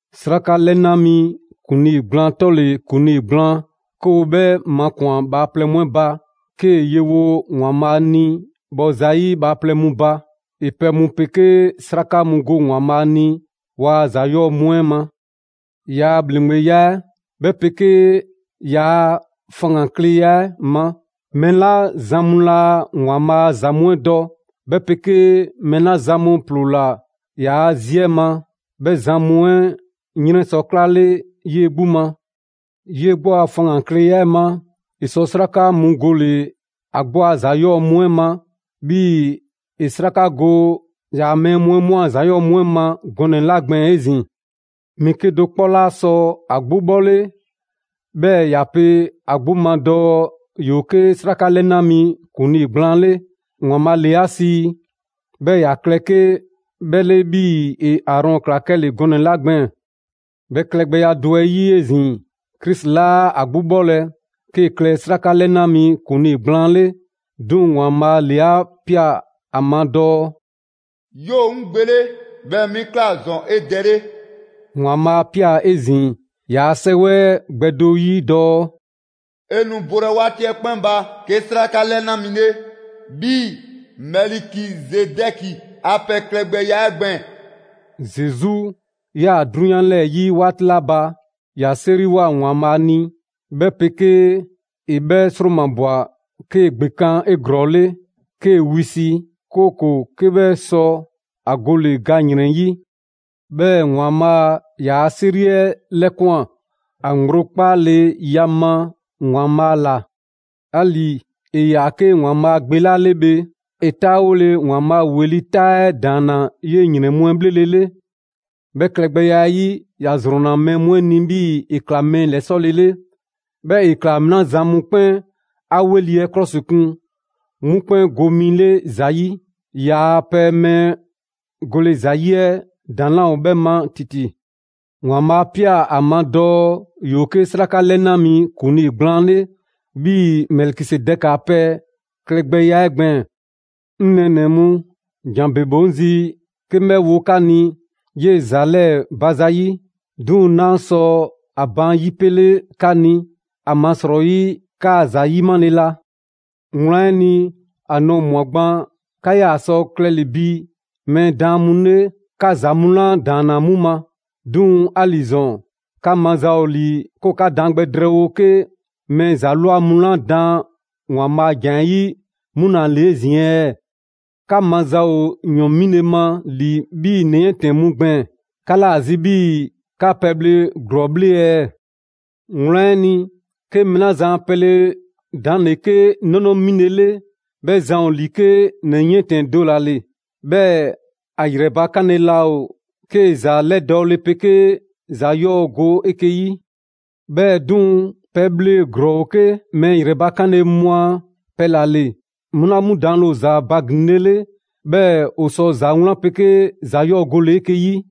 'Sraka 'lɛna mi ‑kuŋlii gblaan 'tɔle‑ ‑kuŋlii gblaan 'ke ‑o 'bhɛ makun bhaaplɛŋ mu 'ɛ ba, 'kee‑ yewo ‑Waanbhaa' ni bhɔ zayi' bhaaplɛŋ mu ba. ‑E pɛ mu 'pegee 'sraka mu go ‑Waanbhaa' ni ‑waa' ‑za 'yɔɔ‑ mu 'ɛ ma. ‑Yaa' bhaaplɛŋya 'ɛ ma, 'bhɛ 'pegee ‑yaa' faŋgankleya 'ɛ ma, mɛɛ 'la zan mu laa ‑Waanbhaa' a ‑za mu 'ɛ dɔ, 'bhɛ 'pegee mɛɛ 'la zan mu ‑ploola ‑yaa' zi 'ɛ ma, 'bhɛ zan mu 'ɛ 'yrɛn sɔ 'klale 'yee‑ 'gbu ma. 'Yee‑ 'gbu a faŋgankleya 'ɛ ma, ‑e sɔ 'sraka mu gole‑ ‑a 'gbu a ‑za 'yɔɔ‑ mu 'ɛ ma, 'bhii‑ ‑e 'sraka go ‑yaa' mɛɛ mu 'ɛ 'mu a ‑za 'yɔɔ‑ mu 'ɛ ma gɔnɛ‑ 'la gbɛɛn‑ 'ezin‑. Mɛɛ 'kedo‑ 'kpɔ 'laa sɔ ‑a 'gbu 'bhɔle, 'bhɛɛ‑ ‑ya pe ‑a 'gbu ma dɔɔ ‑yoo 'ke 'sraka 'lɛna mi ‑kuŋlii gblaan 'le. ‑Waanbhaa' ‑le 'a sii, 'bhɛɛ‑ ‑ya klɛ 'ke 'bhɛ 'le 'bhii‑ ‑e Aarɔn ꞊kla 'kɛle‑ gɔnɛ‑ 'la gbɛɛn‑. 'Bhɛ klɛgbɛya do 'ɛ 'yi 'ezin‑, Krisi 'laa ‑a 'gbu 'bhɔlɛ‑ 'kee‑ klɛ 'Sraka 'lɛna mi ‑kuŋlii gblaan 'le. 'Duŋ‑ ‑Waanbhaa' ‑le 'a ꞊pia ‑a ma dɔɔ: «'Yoo‑ 'ŋ Gbe 'le, 'bhɛɛ‑ 'mi ꞊kla ‑zɔn 'e Dɛ 'le.» ‑Waanbhaa' 'a ꞊pia 'ezin‑ ‑yaa' 'Sɛwɛ 'ɛ gbɛ do 'yi dɔɔ: «'E nu bolɛ 'waati 'ɛ 'kpɛn ba 'ke 'Sraka 'lɛna mi 'le, 'bhii‑Mɛlikizedɛkia pɛ klɛgbɛya 'ɛ gbɛɛn‑.» Zesu 'yaa‑ 'drunyan 'lɛɛ‑ 'yi 'waati 'la ba, ‑ya 'seriwoa ‑Waanbhaa' ni, 'bhɛ 'pegee ‑e 'bhɛ 'sromabwa 'kee‑ ‑gbekan' 'eglɔɔle, 'kee‑ wisi, 'kooko‑ 'ke 'bhɛ sɔ ‑a gole ga ‑yrɛn 'yi. 'Bhɛɛ‑ ‑Waanbhaa' ‑yaa' 'seri 'ɛ 'lɛkwan‑ ‑a ŋgblo 'kpaaleya ma ‑Waanbhaa' ‑la. 'Ali‑ ‑e ‑yaa' 'ke ‑Waanbhaa' Gbe 'la 'le bhe, ‑e 'taawole ‑Waanbhaa' ‑weli' ta 'ɛ ‑daanna 'yee‑ ‑yrɛn mu 'ɛ 'bhlelele. 'Bhɛ klɛgbɛya 'ɛ 'yi, ‑ya ‑zrɔnna mɛɛ mu 'ɛ ni 'bhii‑ ‑e ꞊kla mɛɛ ‑lɛsɔlele. 'Bhɛɛ‑ ‑e ꞊kla mɛɛ 'la zan mu 'kpɛn 'a 'weli‑ 'ɛ 'klɔsikun, 'mu 'kpɛn go mi 'le ‑za 'yi. ‑Yaa' pɛ mɛɛ gole ‑za 'yi 'ɛ ‑daŋ' 'laa ‑o 'bhɛ ma ‑titi. ‑Waanbhaa' 'a ꞊pia ‑a ma dɔɔ ‑yoo 'ke 'sraka 'lɛna mi ‑kuŋlii gblaan 'le, 'bhii‑ Mɛlikizedɛki a pɛ klɛ gbɛya 'ɛ gbɛɛn‑. 'Ŋ nɛɛnɛ‑ mu, ‑jan ‑bebe ‑o 'ŋ zi 'ke 'ŋ 'bhɛ wo 'ka ni 'yee ‑za 'lɛɛ‑ ba za 'yi. 'Duŋ‑ 'naa sɔ ‑a baan' ‑yipele 'ka ni, ‑amasrɔyi 'kaa‑ ‑za 'yimale la. Wlan 'ɛ ni, ‑a nɔɔ‑ ꞊mwa gban 'ka 'yaa‑ sɔ klɛle‑ bi mɛɛ daan mu 'le 'ka ‑za mu 'la ‑daanna 'mu ma. 'Duŋ‑ 'ali‑ ‑zɔn, 'ka maza ‑o ‑li 'ke ‑o 'ka daan gbɛ drɛɛwo 'ke mɛɛ ‑za ꞊lwa mu 'la daan ‑Waanbhaa' a ‑jan 'ɛ 'yi 'mu ‑la ‑le 'ezin‑ ɛɛ? 'Ka maza ‑o ‑yɔn 'mile‑ ma ‑li 'bhii‑ ‑nɛ 'yiɛntɛnnɛ mu gbɛɛn‑, 'ka 'laa‑ zi 'bhii‑ 'ka pɛbhle ‑glɔɔ bhle ɛɛ? Wlan 'ɛ ni, 'ke mɛɛ 'la zan a pɛle ‑daŋ' ‑le 'ke 'nɔnɔ 'mile‑ 'le, 'bhɛ zan ‑o ‑li 'ke ‑nɛ 'yiɛntɛnnɛ do ‑la ‑le. 'Bhɛɛ‑ ‑a ‑yrɛ bakanle laa ‑o 'kee‑ ‑za 'lɛdɔɔle 'pegee ‑za 'yɔɔ‑ go 'eke‑ 'yi. 'Bhɛɛ‑ 'duŋ‑, pɛbhle ‑glɔɔ ‑o 'ke mɛɛ ‑yrɛ bakanle mu a pɛ ‑la ‑le, 'mu 'la 'mu daanle ‑o ‑za mu baglinlele, 'bhɛɛ‑ ‑o sɔ ‑za 'wlan 'pegee ‑za 'yɔɔ‑ gole‑ 'eke‑ 'yi.